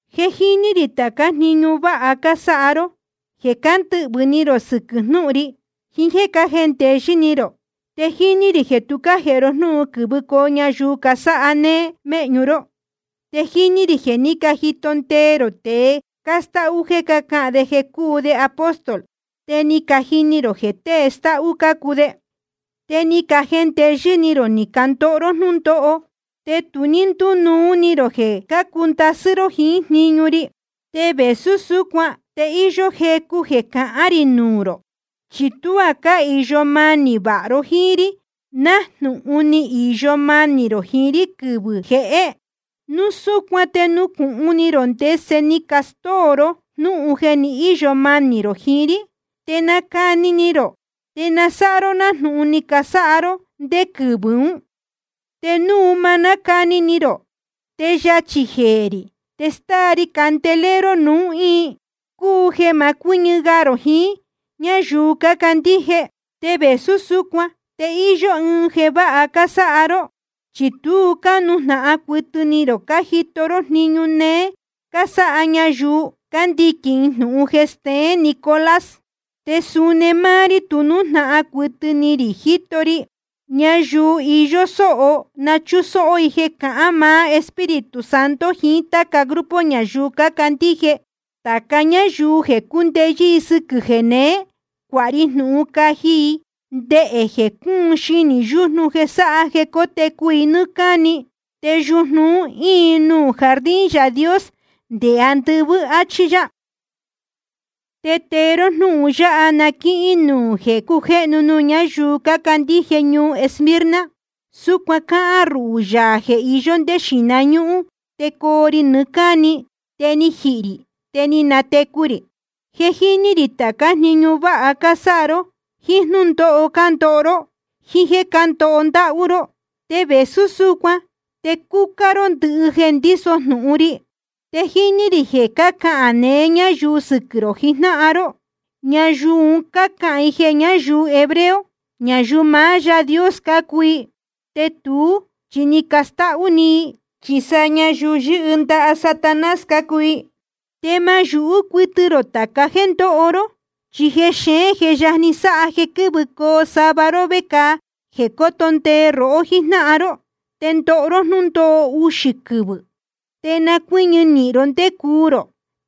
Je jíní rī tācá jniñu váha cásáha ró, jeē cándɨhvɨ̄ ni rō sɨquɨ̄ jnúhun ri, jiín jéē cájendeyɨ́ ni rō. Te jíní rī jeē tu cájēhe ró jnúhun quɨ̄vɨcoo ñayuu casáha néé méhñu ró. Te jíní rī jeē ní cajito ndee rō tēe cástáhú jeē cácahān de jeē cúu de apóstol, te ni cajini rō jeē tée stáhú cácuu de. Te ni cajendeyɨ́ ni rō ni candoho ró jnúndóho, te tu ní ndínuu ni rō jeē cácuu ndasɨ́ ró jíín jniñu ri. Te vēsú súcuan te íyó jecu jeē cahán rī nuū rō, chi tuá cáhīyo manī vāha ró jíín rí nájnūhun ni īyo manī rō jiín rí quɨvɨ̄ jehé. Núu súcuan te nucūhun ni rō ndese ni castóo ró jnúhun jeē ni íyo manī rō jiín rí, te nacani ni rō, te na sáha ró nájnūhun ni casáha ró ndé quɨvɨ̄ ún. Te núu ma nácani ni rō, te yachī jeē rī te stáa ri candelero rō nuū íin, cúu jeē ma cuɨ́ñɨ ga rō jiín ñáyuu cácandíje. Te vēsú súcuan te íyó ɨɨn jeē váha cásáha ró, chi tu cánujnahan cuɨtɨ ni rō cájito ró jniñu néé cásáha ñayuu cándiquīn jnūhun jeē steén Nicolás. Te suni máá rí tu nújnahan cuɨtɨ ni rī jíto ri. Ñayuu iyó sóho na chúsóhó i jeē cahán maá Espíritu Santo jiín táca grupo ñayuu cácandíje. Tāca ñáyuu jeē cúndeyɨ́ sɨ́quɨ̄ jeneé, cuāha ri jnūhun caji i ndehē jeē cúun xinī yújnu jeē sáha jeē cótecu i nɨ́ɨ́ cáni. Te yujnu un íin nuū jardín Yaā Dios nde andɨvɨ́, áchí yá. ’Te tee ró jnúhun yáha na quíhín nuū jeē cujéhnu nuū ñáyuu cácandíje ñuu Esmirna: Súcuan cáhán ruhū, Yaā jeē iyó ndé xīhna ñúhún te coo ri nɨɨ́ cáni, te ni jihī rī te ni natecu rī. Je jíní rī tācá jniñu váha cásáha ró, jíín jnúndóho cándoho ró, jíín jéē cándoho ndáhú ró. Te vēsú súcuan te cúcá ró ndɨhɨ jeē ndíso jnūhun ri. Te jíní rī jeē cácahān neé ñayuu sɨquɨ̄ rō jijnáhan ró. Ñayuu un cácahān i jeē ñáyuu hebreo, ñayuu maá Yaā Dios cácuu i, te tuú chi cástáhú‑ni i, chi sa ñayuu yɨ́hɨ ndaha Satanás cácuu i. Te ma yūhú cuɨtɨ rō tāca jéē ndoho ró. Chi jexeén je yajni sáha jeē quɨ̄vɨcoo sava ró vecāa jeē cóto ndee rohó jíjnáhan ró, te ndoho ró jnúndóho uxī quɨvɨ̄. Te na cuɨ́ñɨ nīhin ró ndé cuu rō,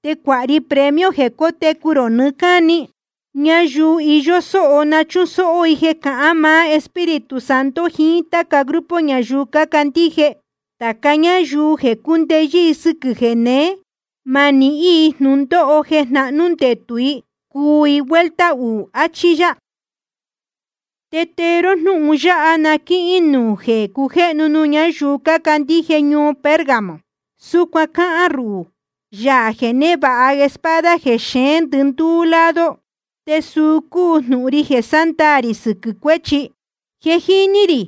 te cuāha ri premio jeē cótecu rō nɨɨ́ cáni. Ñayuu iyó sóho na chúsóhó i jeē cahán maá Espíritu Santo jiín táca grupo ñayuu cácandíje. Tāca ñáyuu jeē cúndeyɨ́ sɨ́quɨ̄ jéneé, ma nihín i jnūndóho jeē jnahnú ndetū i cuu i vuelta uū, achí yá. ’Te tee ró jnúhun yáha na quíhín nuū jeē cujéhnu nuū ñáyuu cácandíje ñuu Pérgamo: Súcuan cáhán ruhū, Yaā jeē névāha espada jeē xeén ndɨndúú lado, te suu cúu jnūhun ri jeē sándaā rī sɨquɨ̄ cuéchi. Je jíní rī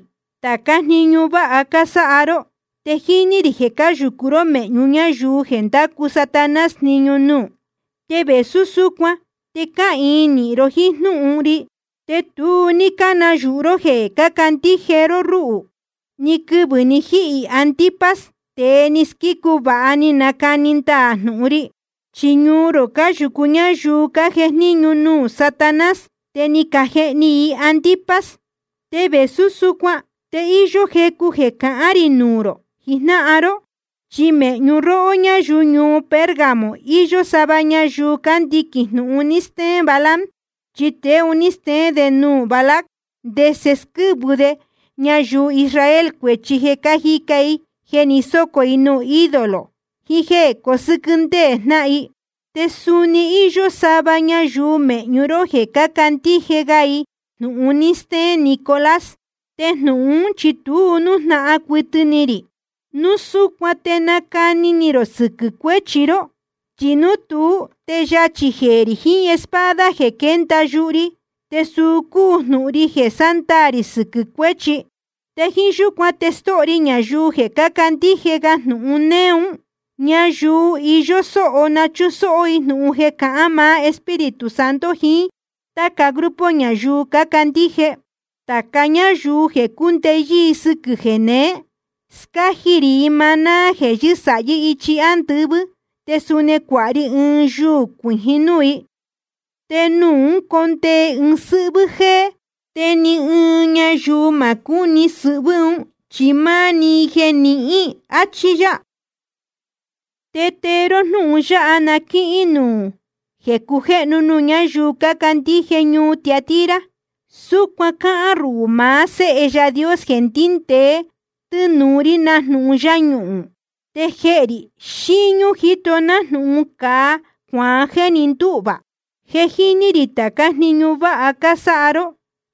tācá jniñu váha cásáha ró, te jíní rī jeē cáyūcu ró mēhñu ñáyuu jeē ndácu Satanás jniñu nuū. Te vēsú súcuan te cáhīin nīhin ró jíín jnúhun ri, te tu ní cánayūhu ró jeē cácandíje ró rúhū, ni quɨvɨ̄ ni jíhī Antipas, tēe ni squícu vāha ni nacani ndaā jnūhun ri. Chi ñuu rō cáyūcu ñáyuu cájejníñu nuū Satanás, te ni cajehni i Antipas. Te vēsú súcuan te íyó jecu jeē cahán rī nuū rō jijnáhan ró. Chi mēhñu róhó ñáyuu ñuu Pérgamo iyó sava ñayuu cándiquīn jnūhun ni steén Balaam. Chi tēe un ní steén de nuū Balac ndese squɨ́vɨ de ñayuu Israel cuēchi jeē cáji i jeē ni sócō nuū ídolo jiín jéē cosɨ́quɨ́ ndéē jnáhan i. Te suni íyó sava ñayuu mēhñu ró jeē cácandíje ga i jnūhun ni steén Nicolás, te jnūhun ún chi tu nújnahan cuɨtɨ ni rī. Núu súcuan te nacani ni rō sɨquɨ̄ cuéchi ró. Chi núu tuú te yachī jeē rī jiín espada jeē quénda yuhu ri, te suu cúu jnūhun ri jeē sándaā rī sɨquɨ̄ cuéchi. Te jíín yúcuan te stóho ri ñayuu jeē candíje ga jnūhun néé un. Ñayuu iyó sóho na chúsóhó i jnūhun jeē cahán maá Espíritu Santo jiín táca grupo ñayuu cácandíje. Tāca ñáyuu jeē cúndeyɨ́ sɨ́quɨ̄ jeneé, scáji rī i maná jeē yɨ́sāhí ichi ándɨvɨ́. Te suni cuāha ri ɨɨn yuū cuijín núū i, te nuū ún condee ɨɨn sɨ́hvɨ́ jéé, te ni ɨɨn ñayuu ma cúni sɨhvɨ́ un, chi máá‑ni i jeē nihín. Achí yá. ’Te tee ró jnúhun yáha na quíhín nuū jeē cujéhnu nuū ñáyuu cácandíje ñuu Tiatira: Súcuan cáhán ruhū, maá Séhe Yaā Dios jeē ndíndēe tɨ́nūu rí nájnūhun yáñuhūn. Te jehē rī xíñú jíto nájnūhun cāa cuaán jéē ni ndúhvā. Je jíní rī tācá jniñu váha cásáha ró,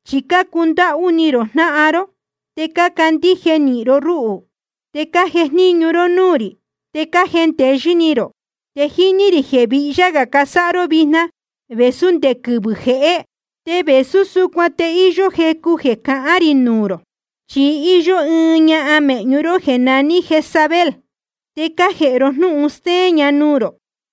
chi cácundáhú ni rō jnáhan ró, te cácandíje nīhin ró rúhū, te cájejníñu ró núū rī, te cájendeyɨ́ ni rō. Te jíní rī jeē vihyá gā cásáha ró vijna vēsú nde quɨvɨ̄ jehé. Te vēsú súcuan te íyó jecu jeē cahán rī nuū rō. Chi íyó ɨɨn ñahan mēhñu ró jéē naní Jezabel, te cájēhe ró jnúhun stéén ña nuū rō.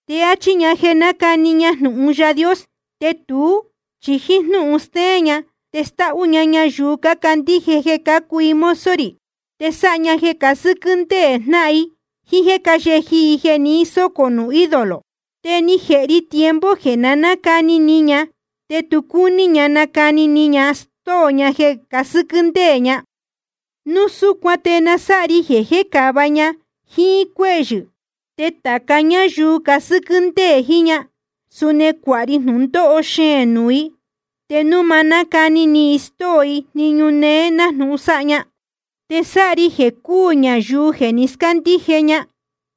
Te áchí ña jeē nácani ña jnūhun Yaā Dios. Te tuú chi jíín jnúhun stéén ña te stáhú ña ñayuu cácandíje jeē cácuu i mozo rī. Te sáha ña jeē casɨ́quɨ́ ndéē jnáhan i, jíín jéē cáyeji i jeē ni sócō nuū ídolo. Te ni jēhe ri tiempo jeē na nácani ni ña, te tu cúní ña nacani ni ña stóo ña jeē casɨ́quɨ́ ndéē ña. Núu súcuan te na sáha ri jeē jécāva ña jíín cuéhyɨ̄. Te tāca ñáyuu casɨ́quɨ́ ndéē jiín ña, suni cuāha ri jnūndóho xeēn nuū i, te núu ma nácani ni i stóo i jniñu néé nájnūhun sáha ña. Te sáha ri jeē cúū ñayuu jeē ni scándíje ña.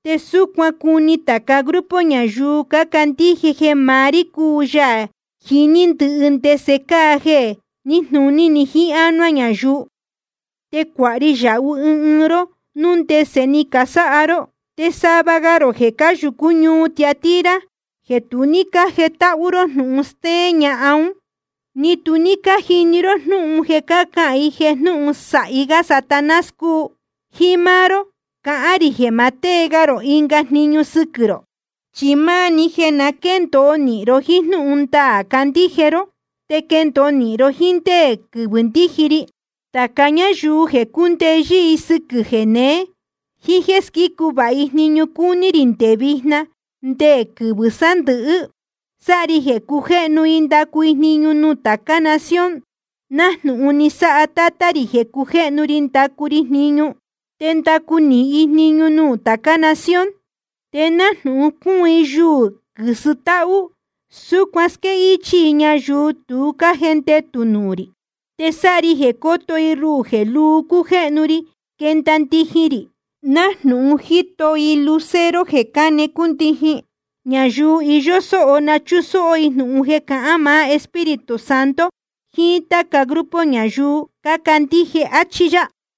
Te súcuan cuni tāca grupo ñayuu cácandíje jeē maá rí cúu Yaā jiní ndɨhɨ ndese cáa jeē níjnūní jiín ánuá ñayuu. Te cuāha ri yāhu ɨɨn ɨɨn ró núu ndese ni casáha ró. Te sava ga rō jeē cáyūcú ñuu Tiatira, jeē tu ní cájetáhú jnūhun stéén ñahan ún, ni tu ní cájnɨɨ ró jnúhun jeē cácahān i jeē jnūhun sāhi gá Satanás cúu, jíín máá ró cahán rī jeē ma tée ga rī ɨnga jniñu sɨquɨ̄ rō. Chi máá‑ni jeē na quéndōo nīhin ró jíín jnúhun ndaā cácandíje ró, te quendōo nīhin ró jíín ndé quɨvɨ̄ ndíji ri. Tāca ñáyuu jeē cúndeyɨ́ sɨ́quɨ̄ jeneé, jíín jéē squícu vāha jniñu cúní rī nde vijna te nde quɨvɨ̄ sándɨ̄hɨ́, sáha ri jeē cujéhnu i ndacu i jniñu nuū tācá nación, nájnūhun ni sáha Tátá rī jeē cujéhnu ri ndácu ri jniñu. Te ndacu nīhin i jniñu nuū tācá nación. Te nájnūhun cúun yúú i quɨ̄sɨ tahú, súcuan squéhichī i ñayuu tu cájendetū nuū rī. Te sáha ri jeē coto i ruhū jeē luu cujéhnu ri quenda ndijin rī, nájnūhun jíto i lucero jeē cáne cúndijin. Ñayuu iyó sóho na chúsóhó i jnūhun jeē cahán maá Espíritu Santo jiín táca grupo ñayuu cácandíje. Achí yá.